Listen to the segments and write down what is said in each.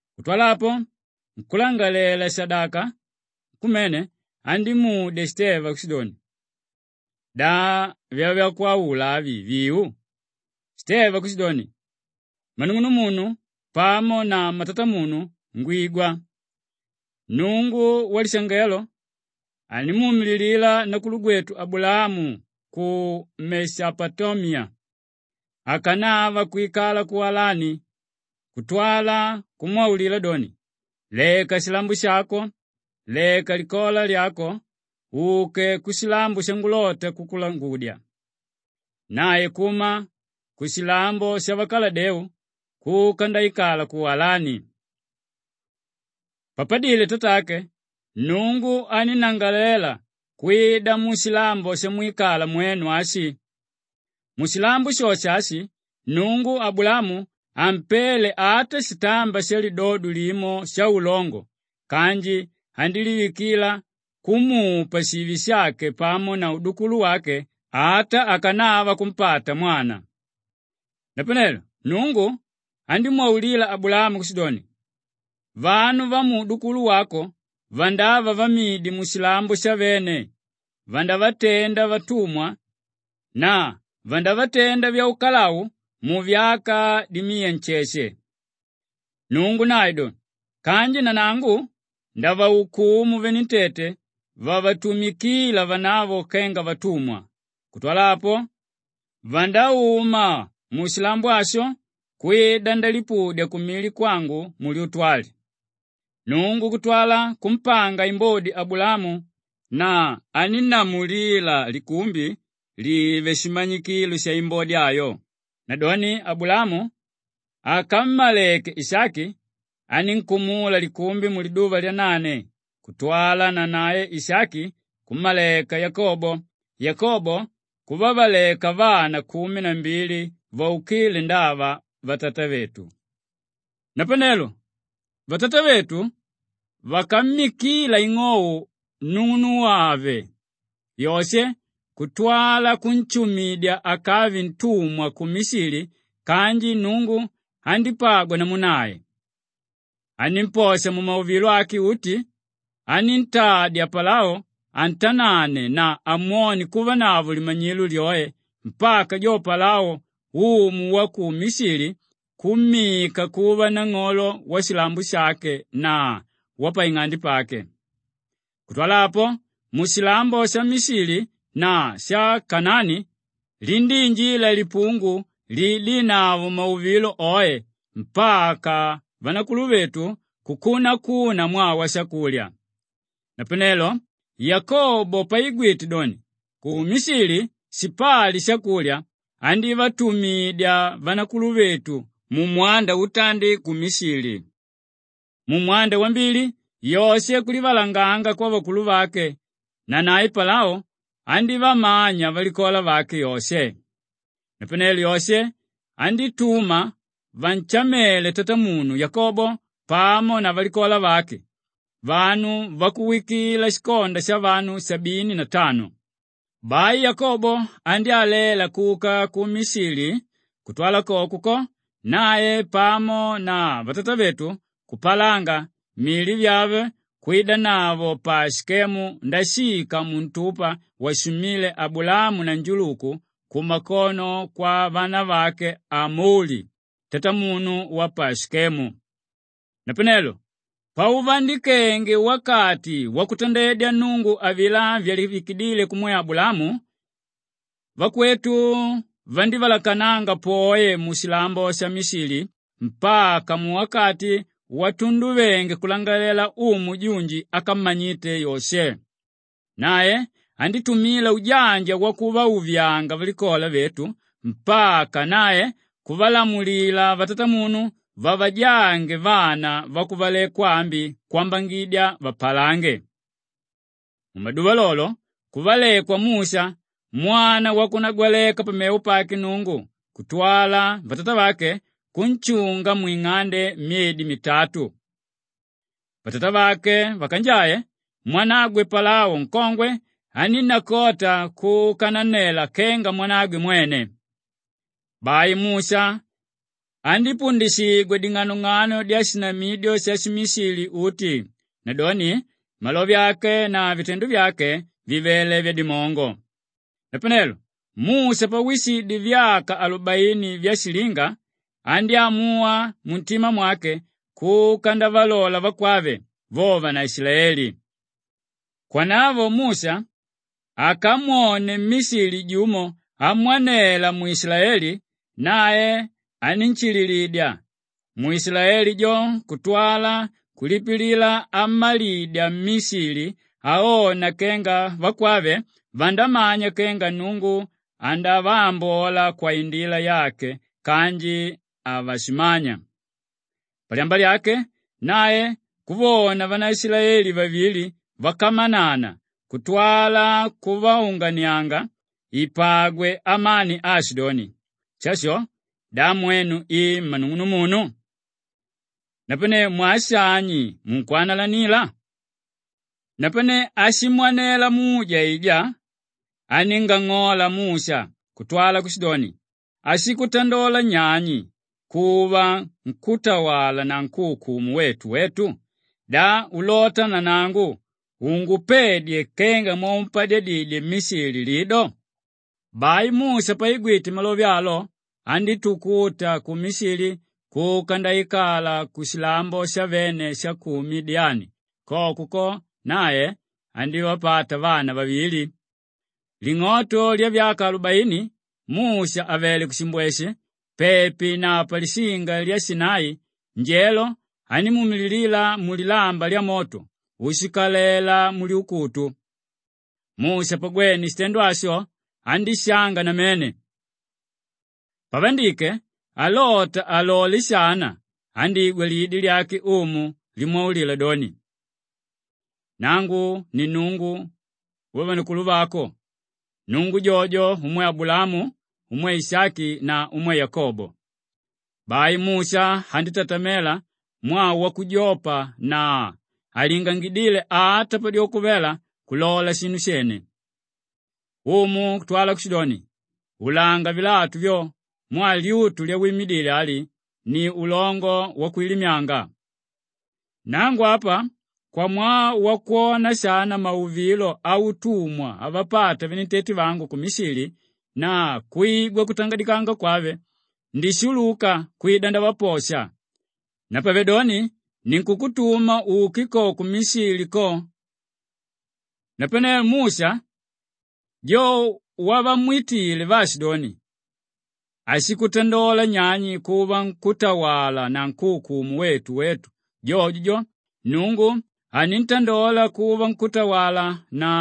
Kutwala apo, nkúlangalalela-shadaka nkumene andímudya Shiteva kushidoni, “Da vyavakwaula avi vìu?” Shiteva kushidoni, “Mmanung'unumunu pamo na mmatatamunu, ngwigwa! Nnungu walishangelo andímuumililila nakulugwetu Abulaamu ku Meshapotamiya akanava kwikala ku Alani kutwala kumwaulila doni, ‘Leka shilambo shako, leka likola lyako uke kushilambo shangulota kukulangudya.’ Nae kuma kushilambo shavakaladeu kuka ndaikala ku Alani. Papadile tatake, Nnungu anínnangalalela kwida mushilambo shamwikala mwenu ashi. Mushilambo shosho ashi, Nnungu Abulaamu hampele ata shitamba shalidodo limo shaulongo kanji andílivikila kumupa shive shake pamo na udukulu wake ata akanava kumpata mwana. “Napanelo Nnungu andímwaulila Abulaamu kushidoni, ‘Vanu vamuudukulu wako vandava vamidi mushilambo shavene, vandavatenda vatumwa na vandavatenda vyaukalau muvyaka dimiya nsheshe.’ Nnungu nae do, ‘Kanji nanangu ndavaukumu venentete vavatumikila vanavo kenga vatumwa. Kutwala apo, vandauma mushilambo asho kwida ndalipudya kumili kwangu mulyutu ali.’ Nnungu kutwala kumpanga imbodi Abulaamu na anínnamulila likumbi live shimanyikilo shaimbodi ayo. Nadoni Abulaamu akammaleke Ishaki anínkumula likumbi muliduva lyanane kutwala nanae Ishaki kummaleka Yakobo, Yakobo kuvavaleka vana kumi na mbili vaukile ndava vatatavetu. “Napanelo vatatavetu vakammikila ing'ou nung'unugwave Yoshe kutwala kunshumidya akave ntumwa ku Mishili kanji Nnungu andípagwa namu nae. Anímposha mumauvilo ake uti, aníntadya Palao antanane na amwone kuvanavo limanyilo lyoe mpaka jo Palao umu wa ku Mishili kummika kuva nang'olo washilambo shake na wapaing'ande pake. Kutwala apo, mushilambo sha Mishili na sha Kanaani lindíinjila lipungu liidínavo mauvilo oe mpaka vanakuluvetu kukunakuna mwaa washakulya. Napanelo Yakobo paigwite doni ku Mishili shipali shakulya, andívatumidya vanakuluvetu mumwanda utandi ku Mishili. Mumwanda wambili Yoshe kulivalanganga kwavakuluvake nanae Palao andívamanya valikola vake Yoshe. Napanelo Yoshe andítuma vanshamele tatamunu Yakobo pamo na valikola vake; vanu vakuwikila shikonda shavanu sabini na tano. Bai Yakobo andyálela kuka ku Mishili kutwala koko ko, nae pamo na vatatavetu kupalanga mili vyave kwidanavo pa Shikemu ndashika muntupa washumíle Abulaamu na njuluku kumakono kwavanavake Amoli tatamunu wa pa Shikemu. “Napanelo pauvandikenge wakati wakutandedya Nnungu avilá vyalivikidíle kumwe Abulaamu, vakwetu vandívalakananga poe mushilambo sha Mishili mpaka muwakati watunduvenge kulangalalela umu junji ákammanyite Yoshe. Nae andítumila ujanja kuvauvyauvyanga valikola vetu mpaka nae kuvalamulila vatatamunu vavajange vana vakuvalekwa ambi kwambangidya vapalange. Mumaduva lolo kuvalekwa Musha mwana wakunagwaleka pamevo pake Nnungu kutwala vatatavake kunshunga mwing'ande myedi mitatu. Vatatavake vakanjae, mwanagwe Palao nkongwe anínnakota kuka nannela kenga mwanagwe mwene. Bai Musha andípundishigwa ding'anong'ano dyashinamidyo shashimishili uti; nadoni, malove ake na vitendo vyake vivele vyadimongo. “Napanelo Musha pawishidye vyaka alubaini vyashilinga andyámuwa muntima mwake kuka ndavalola vakwave, vo vanaishilaeli. Kwanavo Musha akamwone mmishili jumo amwanela mwishilaeli nae anínshililidya mwishilaeli jo kutwala kulipilila ammalidya mmishili aona kenga vakwave vandamanya kenga Nnungu andavaambola kwaindila yake kanji havashimanya. Palyamba lyake nae kuvona vanaishilaeli vavili vakamanana kutwala kuvaunganianga ipagwe amani aashidoni, ‘Shasho da mwenu i mmanung'unumunu? Napanelo mwaa shani munkwanalanila?’ Napane áshimwanela muje aijá aníngang'ola Musha kutwala kushidoni, ‘Áshikutandola nyani kuva nkútawala na nkúukumu wetu wetu? Da ulota nanangu ungupedye kenga mwaumpadyadidye mmishili lido?’ Bai Musha paigwite malove alo andítukuta ku Mishili kuka ndaikala kushilambo shavene sha ku Midiyani; koko ko nae andívapata vana vavili. “Ling'oto lyavyaka alubaini Musha àvele kushimbweshe pepi na palishinga lya Shinai njelo andímuumililila mulilamba lyamoto úshikalela mulyukutu. Musha pagwene shitendo asho andíshanga namene. Pavandike alota alole shana, andígwa lidi lyake Umu limwaulila doni, ‘Nangu ni Nnungu wavanakuluvako; Nnungu jojo umwe Abulaamu, umwe Ishaki na umwe Yakobo.’ Bai Musha andítatamela mwaa wakujopa na halingangidíle ata padyoko vela kulola shinu shene. Umu kutwala kushidoni, ‘Ulanga vilatu vyo mwaa lyutu lyawimidile ali ni ulongo wakwilimyanga. Nangu apa kwamwaa wakwona shana mauvilo autumwa avapata venentete vangu ku Mishili na kwigwa kutangadikanga kwave, ndishuluka kwida ndavaposha; napavedoni, ninkukutuma uke ko ku Mishili ko.’ “Napanelo Musha jo wavamwitíle vaashidoni, ‘Áshikutandola nyani kuva nkútawala na nkúukumu wetu wetu’ jojo jo, Nnungu aníntandola kuva nkútawala na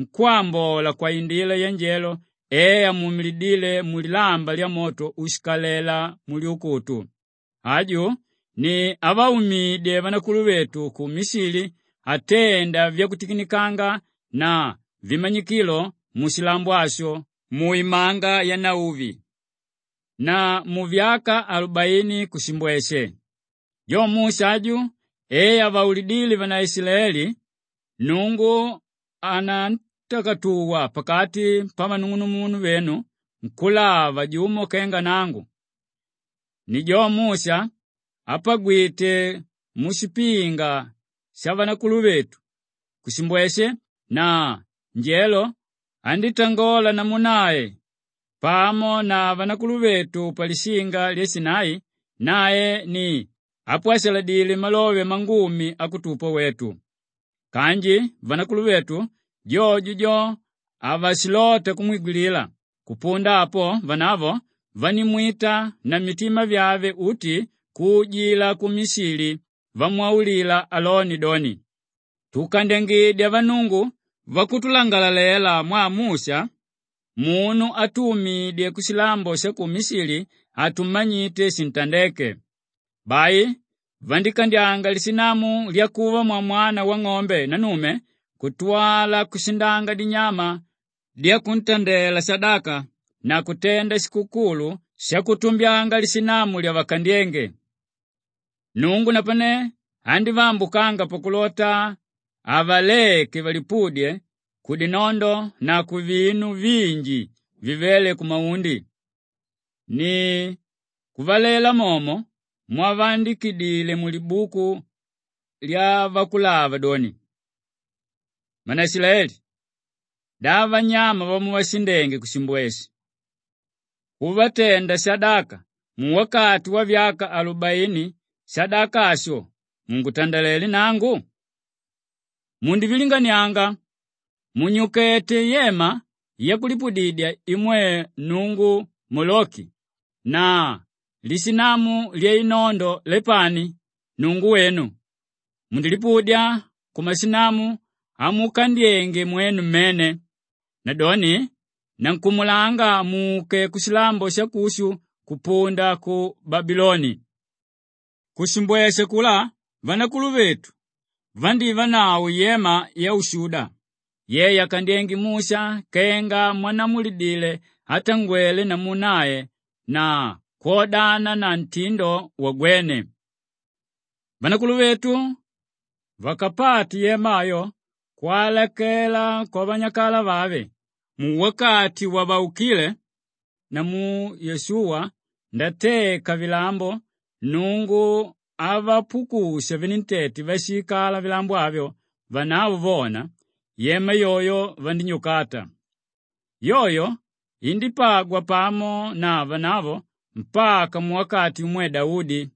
nkwámbola kwaindila yanjelo e amuumilidíle mulilamba lyamoto úshikalela mulyukutu. Aju ni ávaumidye vanakuluvetu ku Mishili atenda vyakutikinikanga na vimanyikilo mushilambo asho, mu Imanga Yanauvi na muvyaka alubaini mushimbweshe. Jo Musha aju e avaulidíle vanaishilaeli, ‘Nnungu anantakatuwa pakati pavanung'unumunu venu nkúlava jumo kenga nangu.’ Ni jo Musha apagwíte mushipinga shavanakuluvetu kushimbweshe na njelo andítangola namu nae pamo na vanakuluvetu palishinga lya Shinai; nae ni ápwashaladile malove mangumi akutupa wetu. Kanji vanakuluvetu jojo jo, havashilota kumwigwilila; kupunda apo vanavo vandímwita na mitima vyave uti kuujila ku Mishili vamwaulila Aloni doni, ‘Tukandyangidya vannungu vatulangalalele mwaa Musha munu átumidye kushilambo sha ku Mishili hatumanyite shintandéke.’ Bai vandíkandyanga lishinamu lyakuva mwamwana wang'ombe nannume kutwala kushindanga dinyama dyakuntandela shadaka na kutenda shikukulu shakutumbyanga lishinamu lyavakandyénge. Nnungu napane andívaambukanga pakulota avaleke valipudye kudinondo na kuvinu vinji vivéle kumaundi. Ni kuvalela momo mwavaandikidile mulibuku lyavakulava doni, “ ‘Mmanaishilaeli! Da vanyama vamuvashindenge kushimbweshe kuvatenda shadaka muwakati wavyaka alubaini, shadaka asho mungutandalelé nangu? Mundivilinganianga! Munyuketé yema yakulipudidya imwe nnungu Moloki na lishinamu lyainondo Lepani, nnungu wenu. Mundilipudya kumashinamu amukandyenge mwenu mmene. Nadoni nankumulanga muke kushilambo shakushu kupunda ku Babiloni.’ “Kushimbweshe akulá vanakuluvetu vandívanavo yema yaushuda ye yakandyénge Musha kenga mwannamulilidíle átangwele namu nae na kwodana na ntindo wagwene. Vanakuluvetu vakapate yema ayo kwalakela kwavanyakalavave, muwakati wavaukile namu Yoshuwa ndateka vilambo Nnungu avapukusha venentete váshiikala vilambo avyo vanavo vona, yema yoyo vandínyukata. Yoyo indípagwa pamo na vanavo mpaka muwakati umwe Daudi,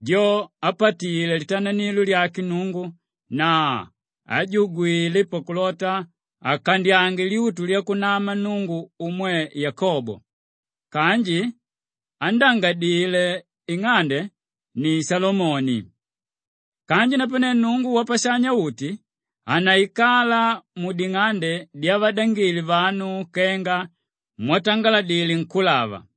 jo ápatile litananilo lyake Nnungu na ájugwile pakulota akandyange lyutu lyakunama Nnungu umwe Yakobo kanji ándangadile ing'ande ni Shalomoni. Kanji napane, Nnungu Wapashanya-uti hanaikala muding'ande dyavadangile vanu kenga mwatangaladile nkúlava,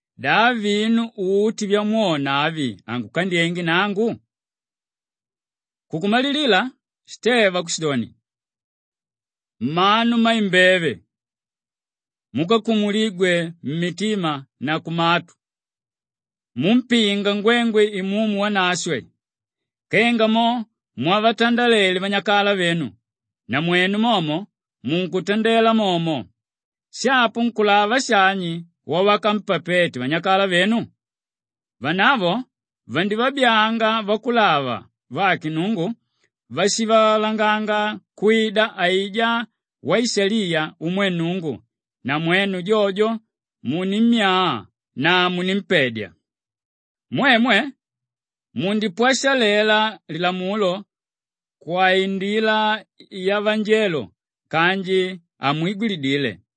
Da vinu uti vyamwona avi hangukandyenge nangu?’” Kukumalilila Shiteva kushidoni, “Mmanu mmaimbeve, múkakumuligwe mmitima na kumatu, múmpinga ngwengwe Imumu Wanashwe. Kenga mo mwavatandalele vanyakalavenu, namwenu momo munkutandela momo. Shapo nkúlava shani wávakampapete vanyakalavenu? Vanavo vandivabyaanga vakulava vake Nnungu váshivalanganga kwida aijá Waishaliya umwe Nnungu na mwenu jojo muninnimya na munimpedya. Mwemwe mundipwashalela Lilamulo kwaindila yavanjelo kanji hamwigwilidile.”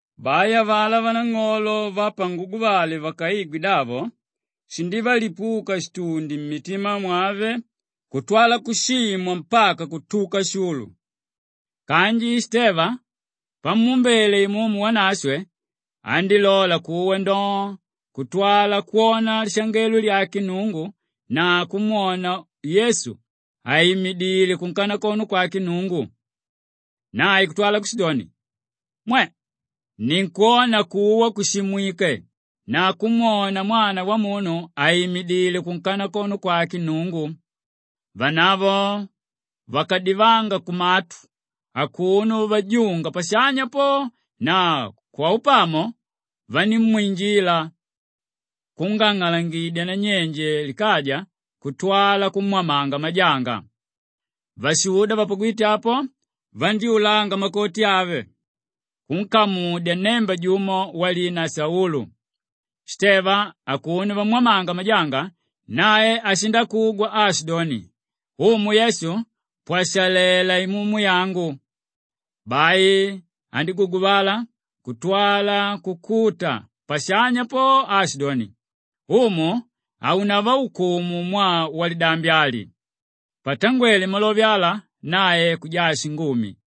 Bai avalá vanang'olo vapanguguvale vakaigwe davo shindívalipuka shitundi mmitima mwave kutwala kushimwa mpaka kutuka shulu. Kanji Shiteva pamuumbele Imumu Wanashwe, andílola kuwa ndoo kutwala kwona lishangelo lyake Nnungu na kumwona Yesu àimidile kunkanakono kwake Nnungu. Nae kutwala kushidoni, “Mwe! Ninkwona kuwa kushimwike na kumwona Mwana Wamunu àimidile kunkanakono kwake Nnungu.” Vanavo vakadivanga kumatu akuno vajunga pashanya po na kwaunapamo vanímwinjila kungang'alangidya kunyenje likaja kutwala kumwamanga majanga. Vashuda vapagwíte apo, vandyúlanga makoti ave kunkamudya nnemba jumo walina Saulu. Shiteva akuno vamwamanga majanga, nae ashindakugwa aashidoni, “Umu Yesu pwashalela imumu yangu!” Bai andíguguvala kutwala kukuta pashanya po, aashidoni, “Umu haunavaukumu mwaa walidambi ali.” Patangwele malove ala, nae kujaa shingumi.